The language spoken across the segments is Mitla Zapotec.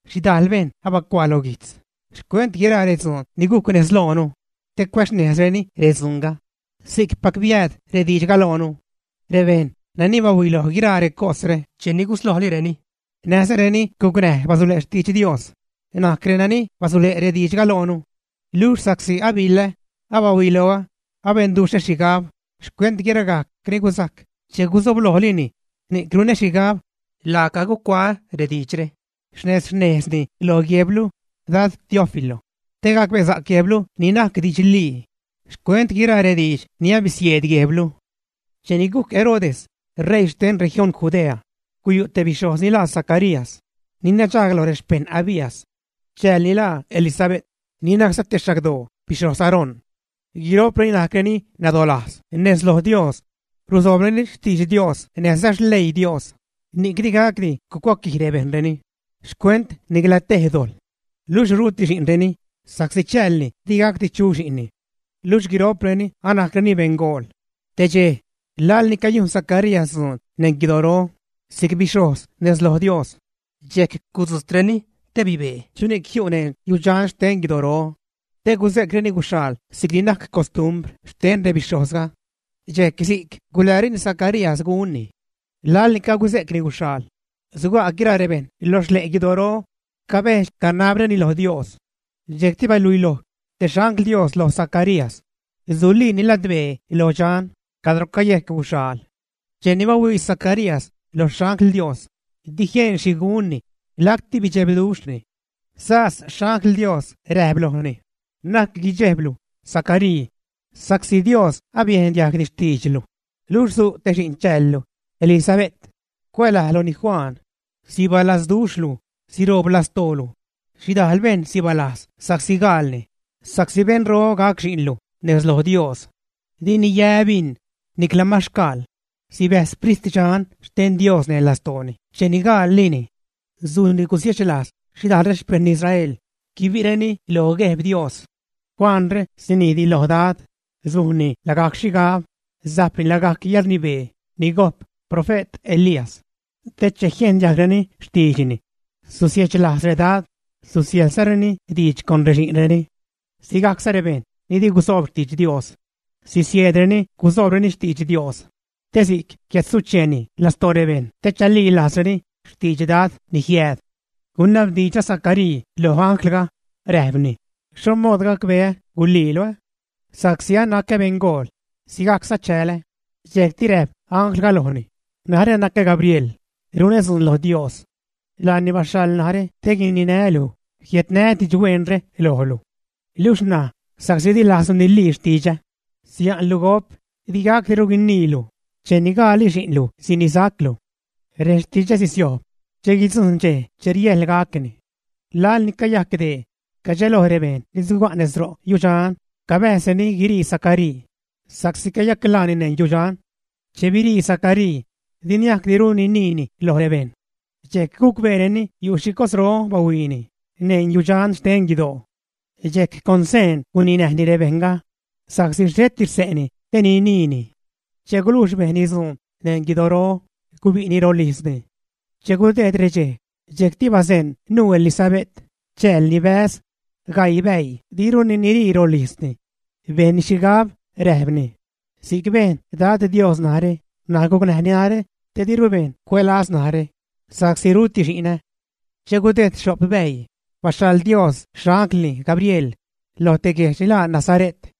Xhidajl bejṉ abacuaa lo guijtz xcuent guiraa redzuun ni gujc nez loonu te cuäxnejzreni redzuunga si'cpac ni biääd rediidxga loonu. Rebejṉ nani bahuiloj guiraa recosre cheni guslojlireni, näjza reni gucnäj basule' xtidx Dios najc renani basule' rediidxga loonu. Luxh sa'csi abiḻä, abahuiloä, abenduxhä xhigab xcuent guiragajc ni gusajc che gusoblojlini, ni'c runä xhigab laaca gucuaä rediidxre, xnejz-xnejzni lo guejblu, Dad Teófilo, te gacbesa'c guejblu ni najc didxlii xcuent guiraa rediidx ni abisieed guejblu. Cheni gujc Herodes ṟeii xten región Judea, guyu' te bixhojz ni laa Zacarías, ni nadxaag lo rexpejṉ Abías. Chäälni laa Elisabe't, ni najcza te xagdoo bixhoz Aarón. Guiro'preni najcreni nadolajz nez loj Dios, rusoobreni xtidx Dios näjza xleii Dios, ni'c digacdi gucuaquij bejṉreni xcuent nicla tej dojḻ. Luxh ruti xi'nreni, sa'csi chäälni digacdi chu xi'nni. Luxh guiro'preni anajcreni beṉgool. Te dxej, laḻ ni cayujn Zacarías dzuun neṉ guidoro si'c bixhojz nez loj Dios, dxejc con daad bibee chuni'c jiu' neṉ yudxan xten guidoro te guze'creni yaal si'cni najc costumbr xten rebixhojzga. Dxejc si'c gulereni Zacarías gunni. Laḻ ni caguze'cni guxhyaal, suga' guiraa rebejṉ lo xle' guidoro, cabedx-canabreni lo Dios. Dxejcti baluiloj te xangl Dios lo Zacarías, suliini ladbee lo dxan cadro cayejc guxhyaal. Che bahuii Zacarías lo xangl Dios, di jien xhi gunni, lacti bidxebduxhni. Sas xangl Dios räjp lojni: ―Na'c guidxejblu, Zacaríi, sa'csi Dios abiejn diajgni xtiidxlu, luxh su' te xi'n chäälu, Elisabe't; cuälajluni Juan. Sibalazduxhlu, siroob lastoolu; xhidajl bejṉ sibalajz sa'csi gaalni, sa'csi beṉro gac xi'nlu nez loj Dios. Dini yä bin, nicla maxcaal. Sibäjz Sprit Dxan xten Dios neṉ lastooni cheni gaallini. Sujnni gusiechlajz xhidajl rexpejṉ Israel, guibi'reni lo Gueb Dios. Juanre sinijdni loj Dad, sujni lagajc xhigab, sajpni lagajc yäḻrnibee ni gojp profe't Elías, te che jiejn diajgreni xtiidxni susiechlajz redad, susiäjḻzareni diidx con rexi'nreni. Sigajcza rebejṉ ni di gusoob xtidx Dios sisieedreni gusoobreni xtidx Dios, te si'c jiädsucheeni lastoo rebejṉ te chalilajzreni xtidx Dad ni jiääd. Gunabdiidx Zacaríi loj anglga, räjpni: ―¿Xho mood gacbeä guliilu? Sa'csi anacä beṉgol, sigajcza chälä. Dxejcti räjp anglga lojni: ―Narä nacä Gabriel, runä dzuun lo Dios. Laani baxhaḻni narä te guininää́ luj, jiädnää́ didxhueenre lojlu. Luxh ṉaj, sa'csi dilajzlu nilii xtidxä, sia'nlu gop, digacdiru guiniilu, cheni gaalli xi'nlu sinisaclu. Rextidxä sisiojb che guidzujṉ dxej che riäjḻ gacni. Laḻni cayajc dee, cadxeloj rebejṉ ni suga' nez ro' yudxan cabäjzreni guiṟii Zacaríi sa'csi cayaclaani neṉ yudxan. Che biṟii Zacaríi, di niajcdiru niniini loj rebejṉ; dxejc gucbeereni yu' xhi cosro bahuiini neṉ yudxan xten guidoo. Dxejc con seen guninäjni rebejṉga, sa'csi xheti xse'ni te niniini. Che gulujx bejnni dzuun neṉ guidoro, gubi'ni rolijzni. Che gudejd redxej dxejcti bazeṉ nuu Elisabe't, chäälni, bäz, gaii bäii diruni niṟii rolijzni. Bejnni xhigab, räjpni: “Si'c bejn Dad Dios narä ṉaj, gucnäjni narä te diru bejṉ cuälaz narä sa'csi ruti xi'nä.” Che gudejd xho'p bäii, baxhaḻ Dios xanglni Gabriel lo te guedx Galilee ni laa Nazare't,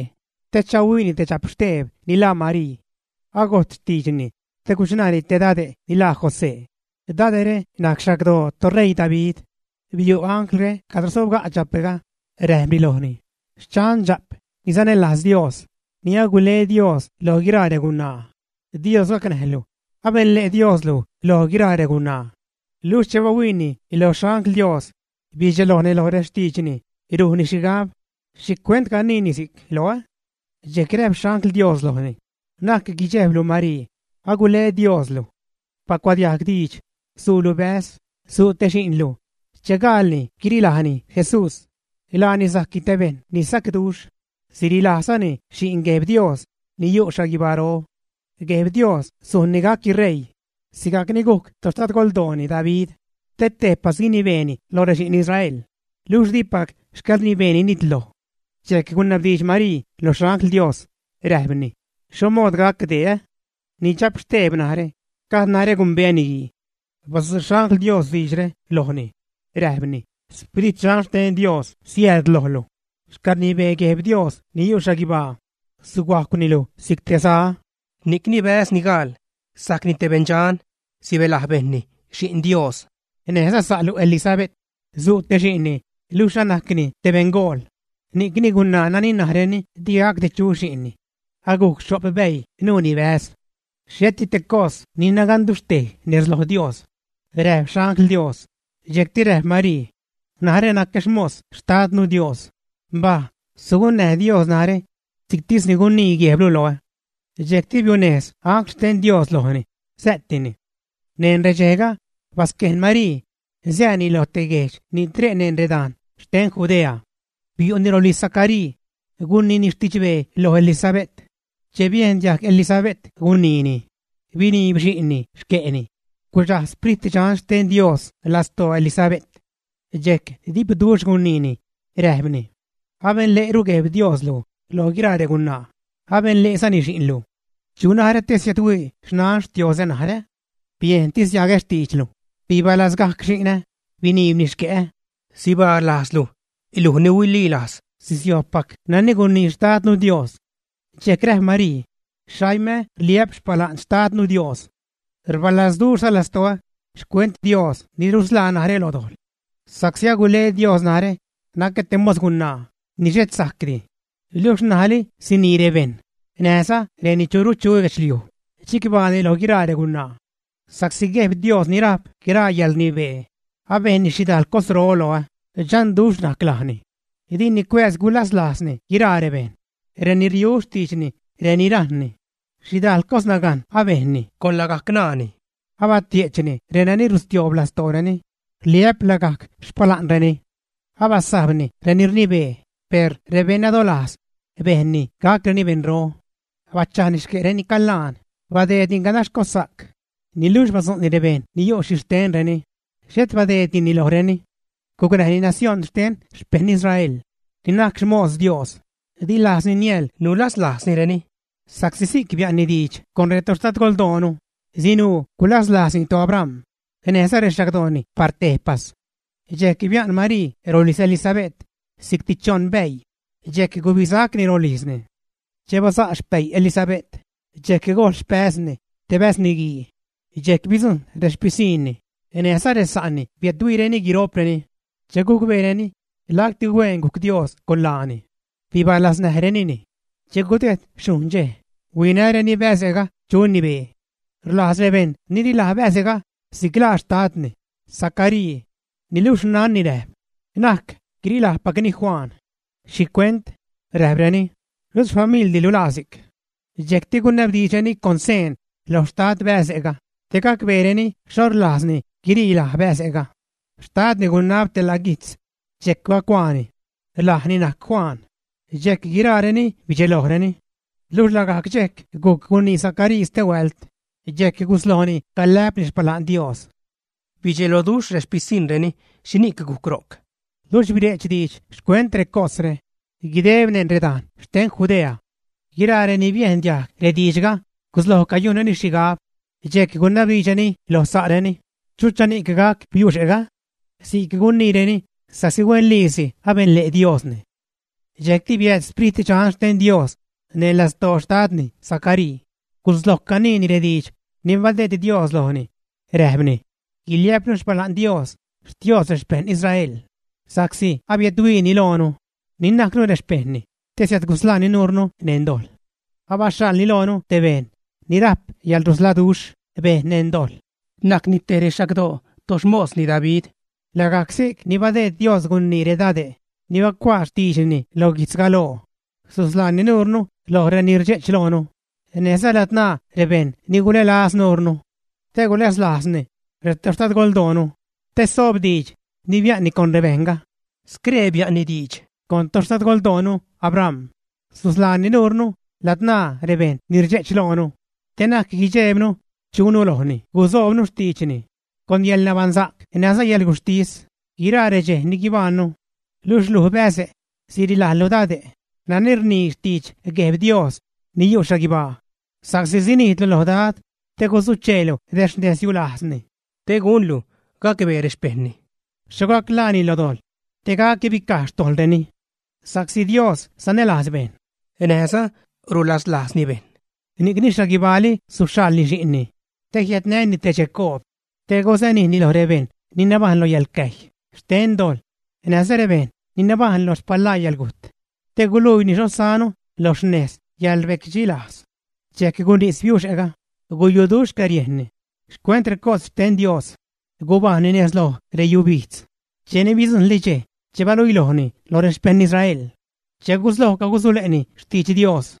te chahuiini te dxapxteeb ni laa Marii. Agojt xtiidxni te guchṉaani te dade' ni laa José. Dade're najc xagdoo toṟeii David. Biu' anglre cadro sobga' dxape'ga, räjpni lojni: ―Xchan, dxa'p ni sanälajz Dios, ni agule Dios loj guiraa regunaa. Dios gacnäjlu. Abenle' Dioslu loj guiraa regunaa. Luxh che bahuiini lo xangl Dios bidxelojni lo rextiidxni, rujnni xhigab: “¿Xhicuent caniini si'c loä?” Dxejc räjp xangl Dios lojni: ―Na'c guidxejblu, Marii; agule Dios luj. Bacuadiajg diidx. Suulu bäz, su' te xi'nlu. Che gaalni guirilajni Jesús. Laani sajcni te bejṉ ni sacduxh. Sirilajzani Xi'n Gueb Dios ni yu' xhaguibaro. Gueb Dios sujn gacni ṟeii sigajc ni gujc toxtadgoldooni David, te tejpas guinibeeni loj rexi'n Israel, luxh dipac xcäḻrnibeeni nitloj. Dxejc gunabdiidx Marii lo xangl Dios, räjpni: ―¿Xho mood gac dee? Ni dxapxteeb narä, gajd narä gumbeä niguii. Badzu' xangl Dios diidxre lojni, räjpni: ―Sprit Dxan xten Dios siääd lojlu, xcäḻrnibee Gueb Dios ni yu' xhaguibaa suhuajcwni luj si'c te za. Ni'cni bäz ni gaal sajcni te beṉdxan, sibälaj bejṉni Xi'n Dios. Näjza sa'lu Elisabe't su' te xi'nni luxh anajcni te beṉgool; ni'cni gunaa nani najreni digacdi chu xi'nni agujc xho'p bäii nuuni bäz. Xheti te cos ni naganduxhtej nez loj Dios ―räjp Xangl Dios. Dxejcti räjp Marii: ―Narä nacä xmos Xtadnu Dios; mbaj, sugunnäj Dios narä si'ctisni gunii gueblu loä. Dxejcti biunejz angl xten Dios lojni, sä'tini. Neṉ redxejga, basquejn Marii sääni lo te guejdx ni tre' neṉ redajn xten Judea. Biu'ni rolijz Zacaríi, guniini xtidxbee loj Elisabe't. Che biejn diajg Elisabe't guniini, biniib xi'nni xque'ni, gudxaj Sprit Dxan xten Dios lastoo Elisabe't. Dxejc dipduxh guniini räjpni: ―Abenle'ru Gueb Dios luj loj guiraa regunaa. Abenle'zani xi'nlu. ¿Chu narä te siädhuii xnan Xtioozä narä? Biejntis diagä xtiidxlu, bibalazgajc xi'nä, biniibni xque'ä. Sibaa lajzlu, luj ni huililajz sisiojbpac nani gunii Xtadnu Dios. Dxejc räjp Marii: Xaimä rliä'p xpala'n Xtadnu Dios. Rbalazduxhza lastoä xcuent Dios ni rusḻaa narä lo dojḻ. Sa'csi agule Dios narä, nacä te mos gunaa ni xhet sajcdi, luxh ṉajli sinii rebejṉ näjza reni churu chu lo guedxliuj, chicbaani loj guiraa regunaa. Sa'csi Gueb Dios ni rajp guiraa yäḻrnibee abejn xhidajl cosro loä, dxanduxh najc lajni. Dini cuääz gulaslajzni guiraa rebejṉ ni riu xtiidxni, reni rajṉni. Xhidajl cosnagajn abejnni con lagajc ṉaani, abatie'chni renani rustioob lastooreni rliä'p lagajc xpala'nreni. Abasajbni reni rnibee, per rebeṉnadolajz bejnni gacreni beṉro. Bachajni xque' reni calaan, badeedni ganax cossa'c, niluxh badzu'ni rebejṉ ni yu' xhixtenreni xhet badeed dini lojreni. Gucnäjni nacióṉ xten xpejṉ Israel, ni najc xmos Dios. Di lajzni niäḻ nulaslajznireni sa'csi si'c bia'nni diidx con retoxtadgoldoonu, sinuu gulazlajzni toAbram näjza rexagdooni par tejpas. Dxejc bia'n Marii rolijz Elisabe't si'cti choṉ bäii, dxejc gubisacni rolijzni. Che baza' xpäi Elisabe't, dxejc gojl xpäzni te bäz niguiini. Dxejc bidzujṉ rexpisiṉni näjza resa'ni biädhuiireni guiro'preni che gucbeereni lacti hueen gujc Dios con laani. Bibalaznäjrenini. Che gudejd xhujṉ dxej, huinäreni bäze'ga chuni bee. Rlajz rebejṉ nirilaj bäze'ga si'c laa xtadni, Zacaríi. Niluxh xnanni räjp: ―Na'c, guirilajpacni Juan. ―¿Xhicuent? ―räjpreni―. Ruti xfamiḻlu ni laa si'c. Dxejcti gunabdiidxreni con seen lo xtad bäze'ga te gacbeereni xho rlajzni guirilaj bäze'ga. Xtadni gunab te la' guijtz, dxejc bacuaani: “Lajni najc Juan.” Dxejc guiraareni bidxelojreni. Luxh lagajc dxejc gujc gunii Zacaríi stehuält, dxejc guslojni calä'pni xpala'n Dios. Bidxeloduxh rexpisiṉreni xhini'c gujc ro'c. Luxh bire'ch diidx xcuent recosre guideb neṉ redajn xten Judea. Guiraa reni biejn diajg rediidxga gusloj cayujnreni xhigab, dxejc gunabdiidxreni loj sa'reni: ―¿Chuchani'c gac biuxe'ga? Si'c guniireni sa'csi huenliisi abenle' Diosni. Dxejcti biääd Sprit Dxan xten Dios neṉ lastoo xtadni Zacaríi, gusloj caniini rediidx ni badeed Dios lojni, räjpni: Guiliä'pnu xpala'n Dios, Xtios rexpejṉ Israel, sa'csi abiädhuiini loonu, ni najcnu rexpejṉni, te siädgusḻaani nuurnu neṉ dojḻ. Abaxhaḻni loonu te bejṉ ni rajp yäḻrusḻaduxh bejṉ neṉ dojḻ. Najcni te rexagdoo toxmosni David. Lagajc si'cni badeed Dios gunii redade' ni bacuaa xtiidxni lo guijtz galoo: Susḻaani nuurnu loj reni rdxe'ch loonu, näjza ladzṉaa rebejṉ ni gulälaz nurnu. Te gulaslajzni retoxtadgoldoonu, te soob diidx ni bia'nni con rebejṉga. Scree bia'nni diidx con toxtadgoldoonu, Abram: Susḻaani nuurnu ladzṉaa rebejṉ ni rdxe'ch loonu, te na'c guidxeebnu chunu lojni gusoobnu xtiidxni, con yäḻnabaṉsa'c näjza yäḻguxhtis guiraa redxej ni guibajṉnu. Luxh luj, bäze', sirilajlu dade' nani rnii xtidx Gueb Dios ni yu' xhaguibaa, sa'csi sinijdlu lo Dad te gusucheelu rexnezyulajzni, te gunlu gacbee rexpejṉni xho gac ḻaani lo dojḻ, te gac guibicaj xtojḻreni. Sa'csi Dios sanälajz bejṉ, näjza rulaslajzni bejṉ ni'cni xhaguibaali suxhaḻni xi'nni te jiädnäni te dxecoob, te gusanijni lo rebejṉ ni nabajṉ lo yäḻxcäjy xten dojḻ, näjza rebejṉ ni nabajṉ lo xpalaa yäḻgujt, te guluiini xho sánu lo xnez yäḻrbecdxilajz. Dxejc gunís biuxe'ga, guyuduxh xcäriejnni xcuent recos xten Dios. Gubajṉni nez loj reyubijdz cheni bidzujṉli dxej che baluilojni loj rexpejṉ Israel, che gusloj cagusule'ni xtidx Dios.